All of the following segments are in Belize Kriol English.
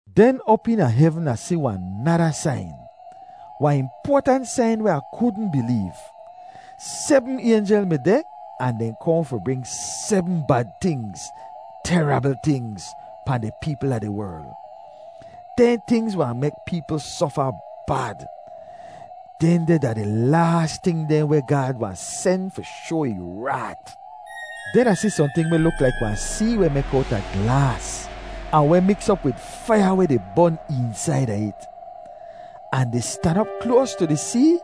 Den op eena hevn Ah si wahn nada sain, wahn impoatant sain weh Ah kudn bileev. Sebm aynjel mi deh ahn dehn kohn fi bring sebm bad tingz, terabl tingz, pahn di peepl a di werl. Dehn tingz wahn mek peepl sofa bad. Dehndeh da di laas ting dehn weh Gaad wahn sen fi shoa ih raat. Den Ah si sohnting weh luk laik wahn see weh mek owta glaas ahn weh miks op wid faiya weh di bon eensaida it. Ahn di stan op kloas tu di see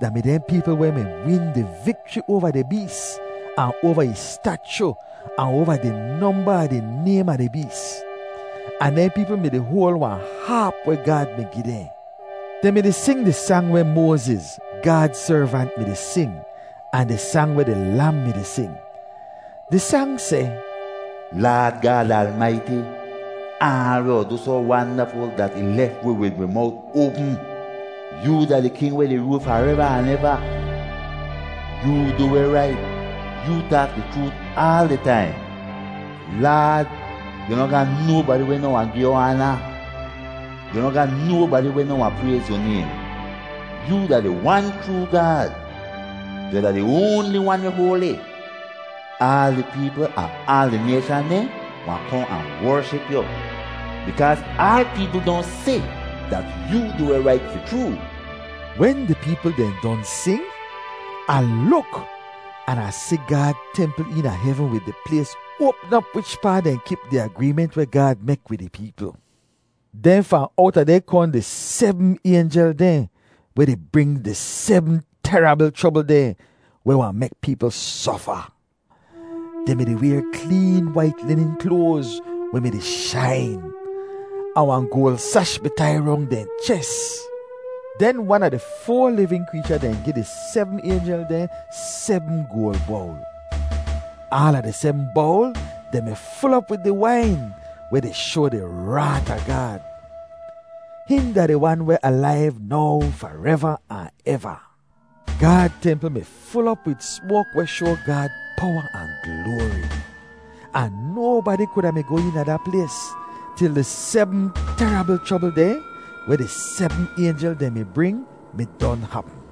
da mi dehn peepl weh mi win di vikchri oava di bees ahn oava ih stachu ahn oava di nomba a di naym a di bees. Ahn dehn peepl mi-di hoal wahn haap weh Gaad mi gi dehn. Dehn mi-di sing di sang weh Moaziz, Gaad servant, mi-di sing ahn di sang weh di Lam mi-di sing. Di sang seh, “Laad Gaad Almaiti, aal weh yu du soh wandaful dat ih lef wi wid wi mowt oapm. Yoo da di King weh di rool fareva ahn eva. Yoo du weh rait; yoo taak di chroot aal di taim. Laad, yu noh ga nobadi weh noh wahn gi yu aana; yu noh ga nobadi weh noh wahn prayz yu naym. Yoo da di Wan chroo Gaad; yu da di oanli wan weh hoali. Aal di peepl a aal di nayshan dehn wahn kohn ahn wership yu, bikaaz aal peepl don si dat yoo du weh rait fi chroo.” Wen di peepl dehn don sing, Ah luk an Ah si Gaad templ eena hevn wid di plays oapm op wichpaa dehn kip di agreement weh Gaad mek wid ih peepl. Den fahn owta deh kohn di sebm aynjel dehn weh di bring di sebm terabl chrobl dehn weh wahn mek peepl sofa. Dehn mi-di wayr kleen wait linin kloaz weh mi-di shain. Ahn wahn goal sash mi tai rong dehn ches. Den wan a di foa livin kreecha dehn gi di sebm aynjel dehn sebm goal bowl. Aala di sebm bowl dehn mi ful op wid di wain weh di shoa di raat a Gaad. Hihn da di Wan weh alaiv now fareva ahn eva. Gaad templ mi ful op wid smoak weh shoa Gaad powa ahn gloari. Ahn nobadi kuda mi goh eena da plays til di sebm terabl chrobl dehn weh di sebm aynjel dehn mi bring mi don hapm.